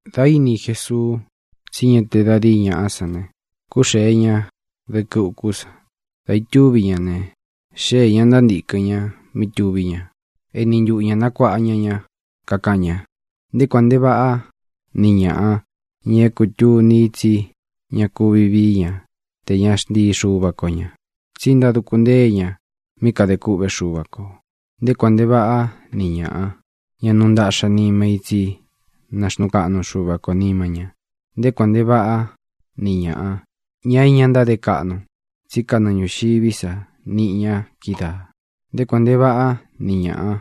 Dā íni Jesuu tsí ña te da díi ñaꞌá san ne, kuxée ña dɨkɨ ukú san. Dā itúvi ña ne, xéē ña ntántīkɨn ña mí tuví ña. Eni ntuꞌu ñā nakuaꞌa ña ña, kakaꞌan ña: —Nté kuān nte vaꞌá ni ñāꞌa, ña é kūtuni i tsí ña kúvi vii ña te ña xntii Xuva ko ña, tsí ntáduku ntée ña mí kadē kûꞌvé Xuva kō. ʼNté kuān nte vaꞌá ni ñāꞌa, ña nuu ntaꞌxa nima í, tsi náxnuu kaꞌnu Xuva kō nima ña. ʼNté kuān nte vaꞌá ni ñāꞌa, ña é ña ntáde kaꞌnu, tsí kanɨɨ ñūxiví sa niꞌi ña kídaā. ʼNté kuān nte vaꞌá ni ñāꞌa,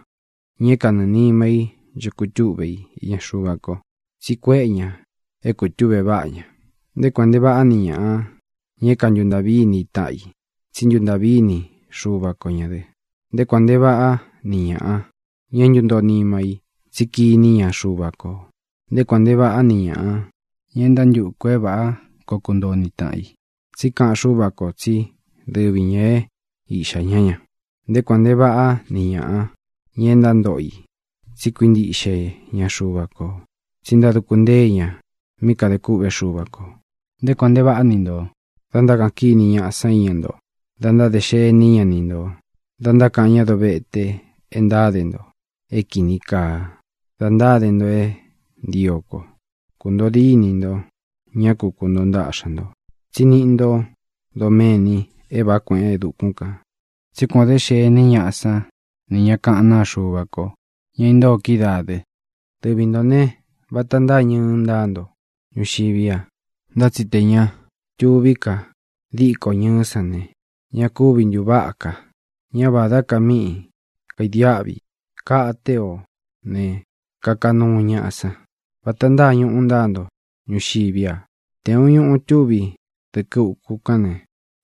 ña é kanɨɨ̄ nima í ncho kutúꞌve i iña Xuva ko, tsí kuéꞌe ña é kūtuꞌve váꞌa ña. ʼNté kuān nte vaꞌá ni ñāꞌa, ña é kantuntāꞌví ini i taꞌan i, tsí ntuntāꞌví ini Xuva ko ñā dɨ. ʼNté kuān nte vaꞌá ni ñāꞌa, ña é ntūntoo nima í, tsi kiní ña Xuva kō. ʼNté kuān nte vaꞌá ni ñāꞌa, ña é ntántukū é vāꞌá koo kuntoo ni tāꞌan i, tsí kaꞌan Xúva kō tsí dɨvi ñā é iꞌxā ñá ña. ʼNté kuān nte vaꞌá ni ñāꞌa, ña é ntántoꞌo i tsí kuíntiꞌxe ña Xuva kō, tsí ntáduku ntée ña mí kadē kûꞌvé Xuva kō. ʼNté kuān nte vaꞌá ni ntō dá ntákaꞌan kíni ñaꞌa san íña nto, dá ntádē xení ña ni ntō, dá ntákaꞌan ña dovete e ntáde nto é kīni kaa da ntáde nto é ntio ko. Kūntoo dínī nto, ñá ku kuntoo ntaꞌxa ntō, tsí niꞌi ntó doméni é vāꞌá kueꞌen e dukún kān, tsí kuān o dé xení ñaꞌa san ni ñá kaꞌán naa Xuva ko, ña intóo kídaā dɨ. ʼDɨvi ntō ne, vata ntáa ñɨɨ ntáa nto ñuxiví a. Ntá tsi tē ña tuví ka díkō ñɨɨ́ san ne, ña kúvi ntūváꞌa ka. Ñá vādá ka mí kaidiáꞌvi i. Kate ó ne, kaka nuu ñaꞌa san. ʼVata ntáa ñūꞌu ntáa nto ñuxiví a. Tē uun ñuú tuví dɨkɨ uku kán ne,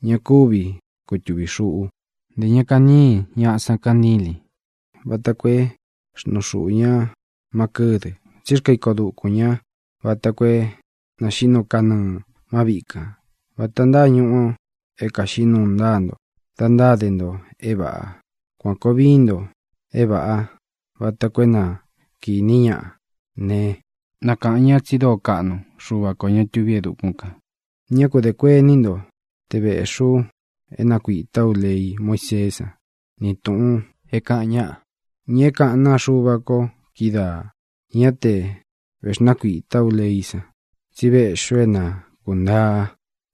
ña kúvi kutūvi xuꞌu. Ntē ña kañíi ñaꞌa san kantílīn vata koo é xnuu xuꞌū ña má kɨdɨ. Tsí xkaa iko dukūn ña vata koo é nāxiꞌí nuu kanɨɨ̄ má viꞌi kān. Vata ntáa ñūꞌu é kaxiꞌí nuu ntáa nto da ntáde ntō é vāꞌa. Kuan kōo vií nto é vāꞌá vata koo é na kīní ñaꞌa ne, na kāꞌan ñá tsi dóo kaꞌnu Xuva kō, ña tuví e dukún kān. ʼÑá ku dē kuení nto te véꞌxī ú é nakuītá u lei Muíseé san ni tūꞌun é kāꞌan ñáꞌa, ña é kaꞌán naa Xuva ko kídaā. Ñá te vēxnákuītá u leí san, tsí véꞌxī ú é na kūntaa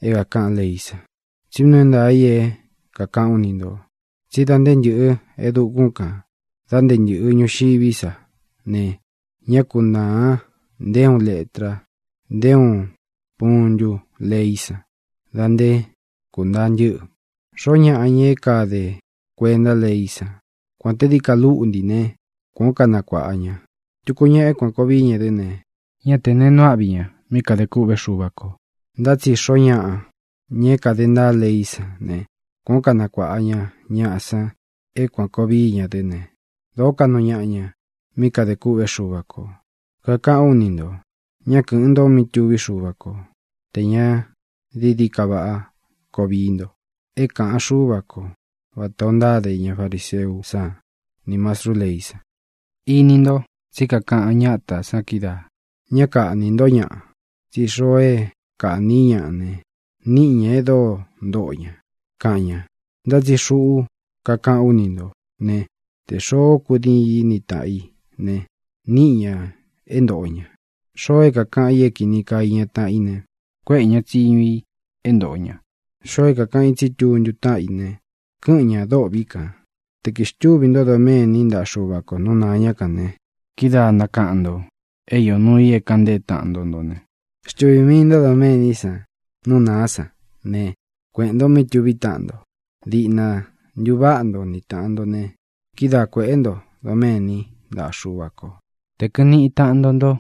é kākaꞌan leí san. Tsí nuu é ntaā i é kākaꞌán u ni ntō tsí da nté ntɨ̄ꞌɨ e dukún kān, da nté ntɨ̄ꞌɨ ñuxiví sa ne, ñá kunāa nté uun letra, nté uun puntu leí san da nté kūntaa ntɨ́ꞌɨ. Xoó ñaꞌa, ña é ña káde kuenta leí san, kuān te dií ka lúꞌntī né, kuān ó kanakuāꞌa ña tuku ñaꞌa é kuān koo vií ña dɨ́ ne, ñá tē neé nuu áꞌvi ña mí kadē kûꞌvé Xuva kō. Ntá tsi xoó ñaꞌa, ña é kāde ntaá leí san ne, kuān ó kanakuāꞌa ña ñaꞌa san é kuān koo vií ña dɨ́ ne, dōo kaꞌnu ñaꞌa ña mí kadē kûꞌvé Xuva kō. Kakaꞌán u ni ntō: ñá kɨ̄ꞌɨn nto mí tuví Xuva ko tē ña dií dií ka váꞌa koo vii nto é kāꞌan Xúva ko vatā ó ntáde ña fariseú san nī mastrú leí san. ʼIni nto tsí kakaꞌan ñátā san kídaā: “Ñá kaꞌnī ntó ñaꞌa, tsí xoo é kaꞌní i ñaꞌa ne, níꞌi ña e dóo ntoꞌo ña”, kaꞌan ña. Ntá tsi xuꞌú kakaꞌán u ni ntō né, tē xoó kudiin í ni tāꞌan i ne, níꞌi ña é ntōꞌo ña. Xoo é kākaꞌan i é kīni kaa iña taꞌan i ne, kuéꞌē ña tsiñu i é ntōꞌo ña. Xoo é kākaꞌan i tsí tuntu táꞌan i ne, kɨ́ꞌɨn ñā dôꞌvi kan. ʼTē kixtúvī ntó doméni ntaꞌa Xúva kō nú nāa ñá kān ne, kidáa nakaꞌan ntō é iō nuu i é kāꞌan ntée taꞌan nto nto ne, xtuvī mii ntó doméní san nú nāá san ne, kueꞌēn nto mí tuví taꞌan nto. Diꞌna ntuváꞌa nto ni tāꞌan nto ne, kidáa kuēꞌé nto doméni ntaꞌa Xúva kō. ʼTe kɨ̄ꞌɨn niꞌi taꞌan nto nto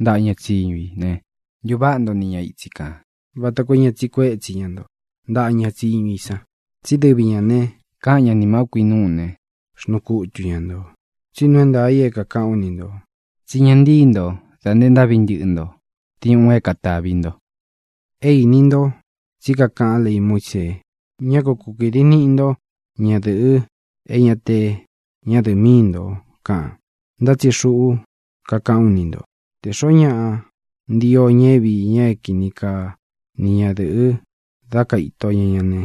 ntaꞌa ña tsíñu i ne, ntuváꞌa nto ni ña itsi kān, vata koo é ña tsiꞌi kuétsi ña nto ntaꞌa ña tsiñu i san. Tsí dɨvi ñā ne, káꞌan ña nī mau kui nuu ne, xnuu kutu ña ntō. Tsí nuu é ntaā i é kākaꞌán u ni ntō tsí ña ntíi nto dā nte ntáꞌvi ntɨꞌɨ nto diuꞌun é katāvi nto. ʼÉ īni nto tsí kakaꞌán lei Muísee: “Ñá ku kukīdi niꞌi nto ñádɨ̄ꞌɨ é ña te ñádɨ̄ꞌɨ míi ntō”, kaꞌan. Ntá tsi xuꞌú kakaꞌán u ni ntō: Tē xoó ñaꞌa ntio ña é viī ña é kini kaa ni ñadɨ̄ꞌɨ dá kaito ña ña ne,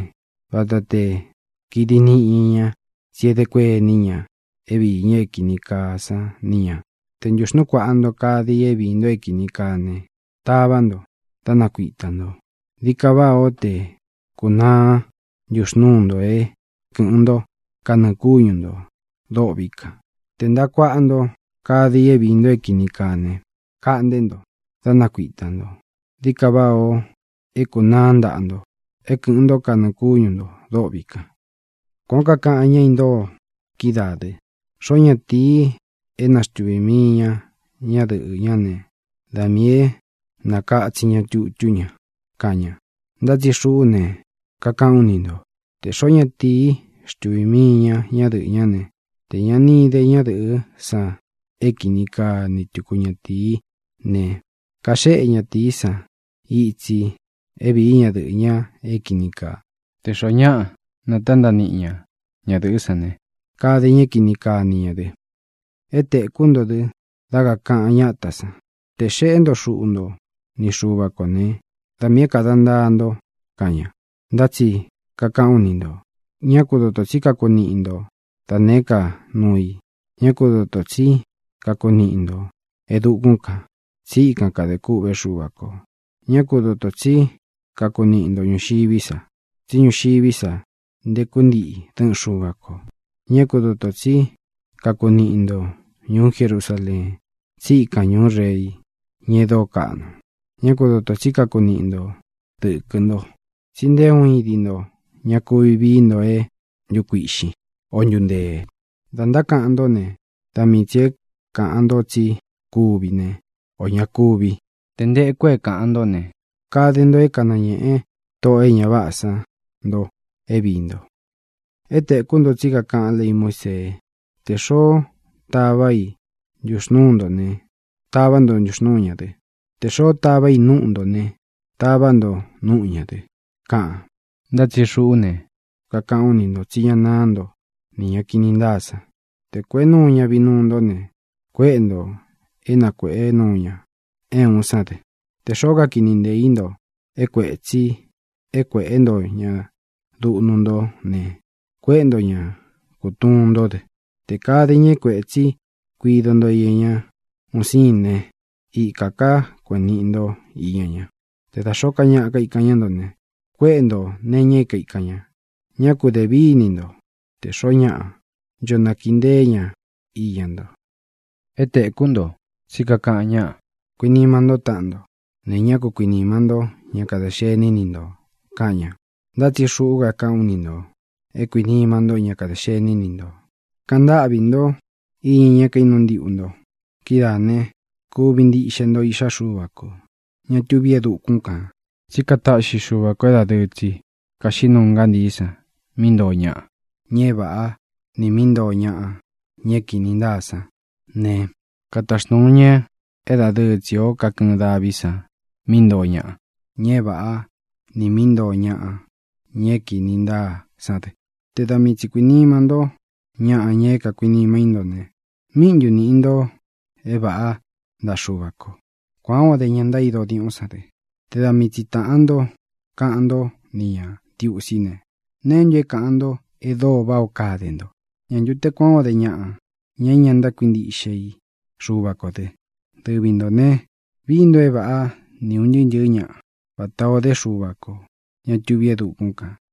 vata te kīdi niꞌi ña ña, tsí edé kuení ña é viī ña é kīni kaa san ni ña. ʼTe ntūxnúu kuāꞌa nto kade i é viī nto é kīni kaa ne, tavá nto, dá nakuitā nto. Dií kaa váꞌā ó te kūnaá ntuxnūú nto é kɨ̄ꞌɨn ntó kanɨɨ̄ kúñu ntō dôꞌvi kan. Te ntāꞌa kuaꞌa nto kade i é viī nto é kīni kaa ne, kaꞌnté nto, dá nakuitā nto. Dií ka váꞌā o é kūnaá ntaꞌa nto é kɨ̄ꞌɨn ntó kanɨɨ̄ kúñu ntō dôꞌvi kan. ʼKuān ó kakaꞌan ña intóo kídaā dɨ: “Xoó ñatīi é naxtuvī mii ña ñadɨꞌɨ́ ña ne, da miī é nakatsin ña tutú ña”, kaꞌan ña. Ntá tsi xuꞌú ne, kakaꞌán u ni ntō: Tē xoó ñatīí xtuvī mii ña ñadɨꞌɨ́ ña ne, tē ña ni ide ñadɨꞌɨ́ san é kini kaa ni tuku ñatīí ne, kaxéꞌe ñatīí san itsi é vīí ñadɨꞌɨ̄ ña é kīni kaa. Tē xoó ñaꞌa natántaꞌa niꞌi ña ñadɨ̄ꞌɨ́ san ne, kade ña é kini kaa ni ñā dɨ. ʼÉ tēkú nto dɨ dá kakāꞌan ñátā san: “Tē xeꞌé nto xuꞌu nto ni Xuva kō né, da miī é kāda ntaa nto”, kaꞌan ña. Ntá tsi kakaꞌán u ni ntō, ñá ku dotō tsí kakuniꞌi nto da nēé ka nuu i. Ñá ku dotō tsí kakuniꞌi ntō e dukún kān, tsí ikan kadē kûꞌvé Xuva kō. Ñá ku dotō tsí kakuniꞌi nto ñūxiví sa, tsí ñuxiví sa nteku ntiꞌi dɨꞌɨn Xuva kō. Ñá ku dotō tsí kakuniꞌi nto ñūú Jerusaleen, tsí ikān ñuú Rei, ña e dóo kaꞌnu. Ñá ku dotō tsí kakuniꞌi nto dɨ̄kɨ nto, tsi nté uun idi nto ña kuvi vií nto é ntukuīꞌxín, o ntuntēe. Dá ntákaꞌan ntó ne, da mii tsī é kāꞌan nto tsí kuvi ne, o ña kúvi. Tē nteku é kāꞌan ntó ne, kade nto é kanañēꞌe tóꞌō e ña váꞌā san nto é viī nto. ʼÉ tēkú nto tsí kakaꞌán lei Muísee: “Tē xoó tavā i ntuxnúū ntó ne, tavá nto ntuxnūú ña dɨ. Tē xoó tavā i núꞌu ntō ne, tavá nto núꞌu ñā dɨ”, kaꞌan. Ntá tsi xuꞌú ne, kakaꞌán u ni ntō tsí ña náā ntó nī ña kini ntáa san. Te kuēꞌé nuu ña vinuu ntó ne, kuéꞌe ntō é na kuēꞌé nuu ña é uun sán dɨ. Tē xoó kakiꞌni nteē í nto é kuētsi e kuéꞌe nto ña duꞌnu ntó ne, kuéꞌe nto ñā kutuun ntó dɨ. Tē kade ñaꞌa é kuētsi kuido nto iña ñá uun sīin né, ikā ká kueꞌēn niꞌi nto íña ña. Te da xōó ka ñaꞌa kaikan ñá nto ne, kuéꞌe ntō nee iña é kaīkan ña. Ñá ku dēvíni nto tē xoó ñaꞌa ncho nakiꞌi nteé ña iña nto. ʼÉ tēkú nto tsí kakaꞌan ñáꞌa: “Kuinima ntó taꞌan nto, ne, ña ku kuinima ntó ña kadē xení ni ntō”, kaꞌan ña. Ntá tsi xuꞌú kakaꞌán u ni ntō e kuinima ntó ña kadē xení ni ntō. Kaꞌan ntáꞌvī ntó iña ña é kainúu ntiꞌu nto. Kidáā ne, kuvi ntiꞌxe nto iꞌxá Xuva kō, ña tuví e dukún kān. Tsí kataꞌxi Xuva kō é dadɨɨ tsi kaxiꞌí nuu ngantií san mí ntoo ñaꞌa, ña é vāꞌá, nī mí ntoo ñaꞌa, ña é kīni ntáa san, ne, kataxnūu ña é dadɨɨ tsi o kakɨɨn daví san mí ntoo ñaꞌa, ña é vāꞌá, nī mí ntoo ñaꞌa, ña é kīni ntáa san dɨ. Te da mii tsī kuinima ntó ñaꞌa, ña é kakuinima í nto ne, ¿míꞌi ntu nīꞌi nto é vāꞌá ntaꞌa Xuva kō? Kuān ó de ña ntaído diuꞌún san dɨ. Te da mii tsi tāꞌan ntó kaꞌan ntó ni ñā ntiusí ne, ¿neé ntu é kāꞌan nto e dóo váꞌā ó kade nto? ¿Ñā ntu te kuán o de ñaꞌā, ña é ña ntákuintiꞌxe i Xuva kō dɨ? Dɨvi ntō ne, vií nto é vāꞌá ni ūn ntɨɨ́ ntɨ̄ɨ́ ñaꞌa, vatā ó de Xuva kō, ña tuví e dukún kān.